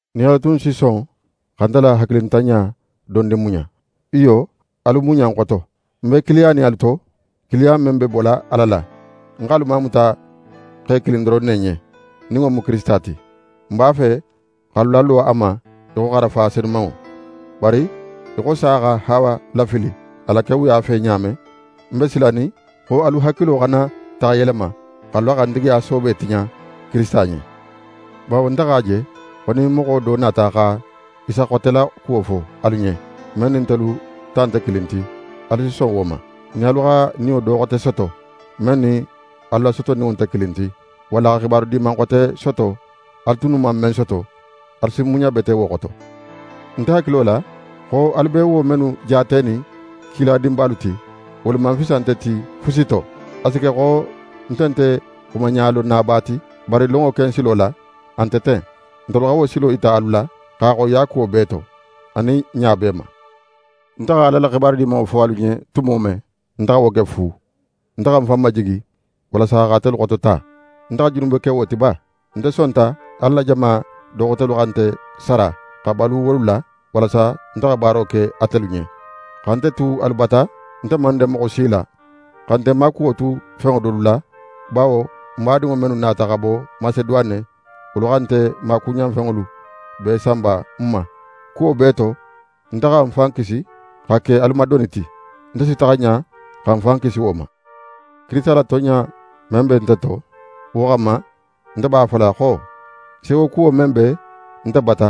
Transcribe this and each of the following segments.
Nin alu tunnu si son xa nte la hakilintanɲa dondin muɲa! Iyo, alu muɲa ń xoto! Nte be kiiliyanin alu to, kiiliya men be bola Ala la. Ń x'alu mamuta xe kilin doron ne ɲen, nin wo mu Kirisita ti. Ń b'a fe x'alu lalo a ma í xo xarafa senumanŋo. Bari, í xo sa xa Hawa lafili a la kewuya fe ɲa men, ń be silanin xo alu hakilo xana taxa yelema, x'alu la xantigiya soobe tiɲa Kirisita ɲen. Bawo nte x'a je xo nin moxo do nata xa Isa xote la kuwo fo alu ɲen, men nin ntelu ta nte kilin ti, alu si son wo ma. Nin alu xa niyo do xote soto, men nin alu la sotoninŋo nte kilin ti, walla xa xibaru Diman xote soto alu tunnu man men soto, alu si muɲa bete wo xoto. Ń hakilo la xo alu be wo mennu jaatenin kiladinbalu ti, wolu man fisa nte ti fusi to. A si ke xo nte nte xumaɲalonnaba ti, bari lonŋo ken silo la, a nte ten. Ntelu xa wo silo yita alu la, x'a xoyiya kuwo bee to, anin ɲa bee ma. Nte xa Ala la Xibaru Dimanŋo fo alu ɲen tumo men, nte xa wo ke fu. Nte xa ń fan majigi, walasa x'atelu xotota. Nte xa junube ke wo ti ba? Nte sonta Ala la jama do xotelu xa nte sara, xa balu wolu la, walasa nte xa baaro ke atelu ɲen. Xa nte tu alu bata, nte man den moxo si la, xa nte maakuwo tu fenŋo dolu la, bawo n badinŋo mennu nata xa bo Maseduwane, wolu xa nte maakuɲanfenŋolu bee sanba ń ma. Kuwo bee to, nte xa ń fan kisi xa ke alu ma doni ti. Nte si taxa ɲa xa ń fan kisi wo ma. Kirisita la tonɲa men be nte to, wo xanma, nte b'a fola xo: Sewokuwo men be nte bata,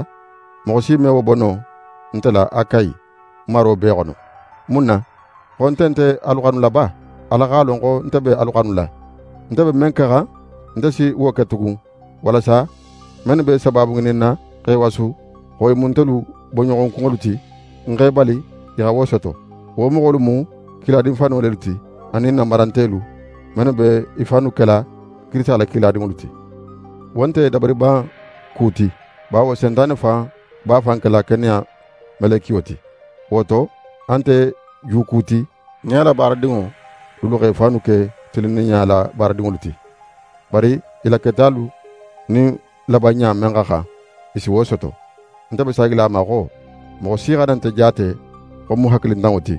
moxo si me wo bo no nte la Akayi maro bee xono. Mun na? Xo nte nte alu xanula ba? Ala x'a lon xo nte be alu xanula! Nte be men kexan, nte si wo ke tugun, walasa mennu be sabaabu ŋininna x'e wasu xo i mu ntelu bonɲoxonkunŋolu ti, n x'e bali i xa wo soto. Wo moxolu mu kiladin fano lelu ti, anin nanbarantelu mennu be i fannu kela Kirisita la kiladinŋolu ti. Wo nte dabariban ku ti, bawo Sentane fan b'a fan kela keneya melekiyo ti. Wo to, a nte ju ku ti nin a la baaradinŋo dulu x'e fannu ke tilinninɲa la baaradinŋolu ti. Bari i la ketalu nin labanɲa men xa xan, i si wo soto. Nte be saagila a ma xo: Moxo si xana nte jaate xo ń mu hakilintanŋo ti!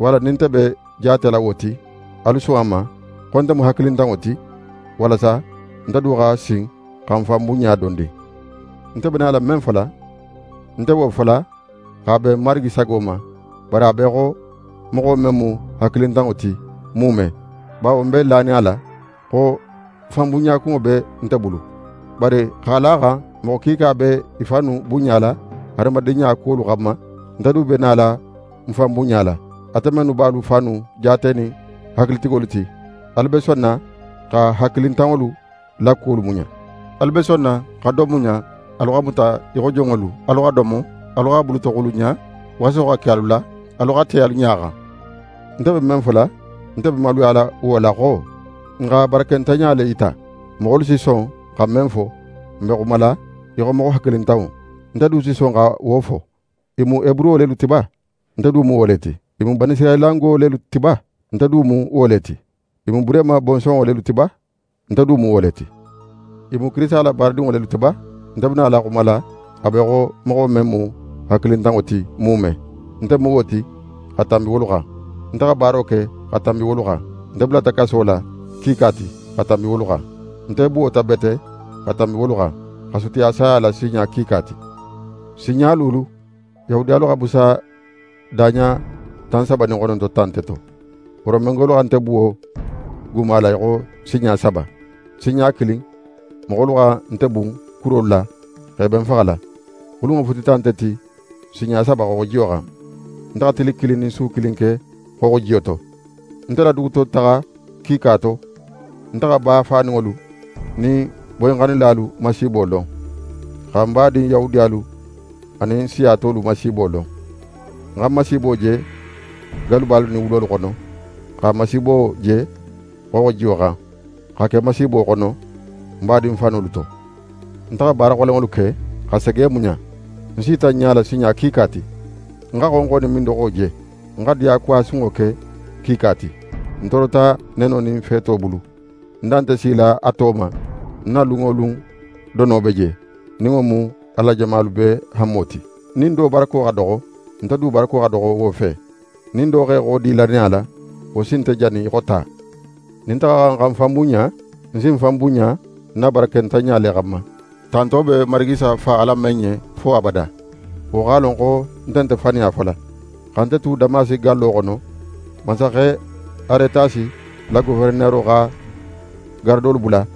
Walla nin nte be jaatela wo ti, alu son a ma xo nte mu hakilintanŋo ti, walasa nte du xa sin xa ń fan bunɲa dondin. Nte be nala men fola, ń nte wo fola x'a ben Marigi sago ma, bari a be í xo moxo men mu hakilintanŋo ti muume, bawo ń be lanin a la xo fanbunɲakunŋo be nte bulu. Bari x'a la a xan moxo kiika be i fannu bunɲala hadamadinɲa kuwolu xanma, nte du be nala ń fan bunɲala. Ate mennu b'alu fannu jaatenin hakilitigolu ti, alu be sonna xa hakilintanŋolu la kuwolu muɲa. Alu be sonna xa don muɲa alu xa muta í xo jonŋolu, alu xa domo, alu xa bulutoxulunɲa, waso xa ke alu la, alu xa te alu ɲa xan. Nte be men fola, nte be maluyala wo la xo: N xa barakentanɲa le yita! Moxolu si son xa men fo, ń be xumala í xo moxo hakilintanŋo, nte du si son xa wo fo. I mu Heburo lelu ti ba? Nte du mu wo le ti. I mu Banisirayilango lelu ti ba? Nte du mu wo le ti. I mu Burehima bonsonŋo lelu ti ba? Nte du mu wo le ti. I mu Kirisita la baaradinŋo lelu ti ba? Nte be nala xumala a be í xo moxo men mu hakilintanŋo ti muume, nte mu wo ti xa tanbi wolu xan. Nte xa baaro ke xa tanbi wolu xan, nte bulata kaso la kiika ti xa tanbi wolu xan. Nte buwota bete xa tanbi wolu xan, xa sutiya saya la sinɲa kiika ti. Sinɲa luulu, Yahudiyalu xa busa daɲa tan saba nin xononto ta nte to. Romengolu xa nte buwo guma la í xo sinɲa saba. Sinɲa kilin, moxolu xa nte bun kurolu la x'e be ń faxala. Xulunŋo futita nte ti sinɲa saba xooxojiyo xan. Nte xa tili kilin nin su kilin ke xooxojiyo to. Nte la dugutotaxa kiika to, nte xa ba faninŋolu nin boyinxannilalu masiibo lon, xa ń badin Yahudiyalu anin siya tolu masiibo lon. Ń xa masiibo je gallubalu nin wulolu xono, xa masiibo je xooxojiyo xan, xa ke masiibo xono ń badin fanolu to. Nte xa baara xolenŋolu ke, xa sege muɲa. Ń sita ń ɲala sinɲa kiika ti. Ń xa xonxo nin mindoxo je. Ń xa diyakuwa sunŋo ke kiika ti. Ń toorota neno nin feeto bulu. Ń da nte sila a to ma, ń na lun wo lun dono be je, nin wo mu Ala la jamalu bee hanmo ti. Nin do barako xa doxo, nte du barako xa doxo wo fe; nin do x'é xodi lannaya la, wo si nte jani í xo ta. Nin nte xa xan xa ń fan bunɲa, ń si ń fan bunɲa ń na barakentanɲa le xanma. Tanto be Marigi Isa Fa Ala men ɲen fo abada, wo x'a lon xo nte nte faniya fola. Xa nte tu Damasi gallo xono, mansaxe Aretasi la goferenero xa garadolu bula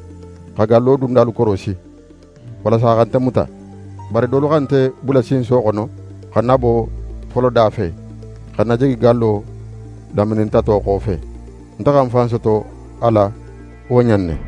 xa gallo dundalu korosi, walasa xa nte muta. Bari dolu xa nte bula sinso xono xa ń nabo foloda fe, xa ń najigi gallo laminintato xofe. Nte xa ń fan soto a la wo ɲa in ne.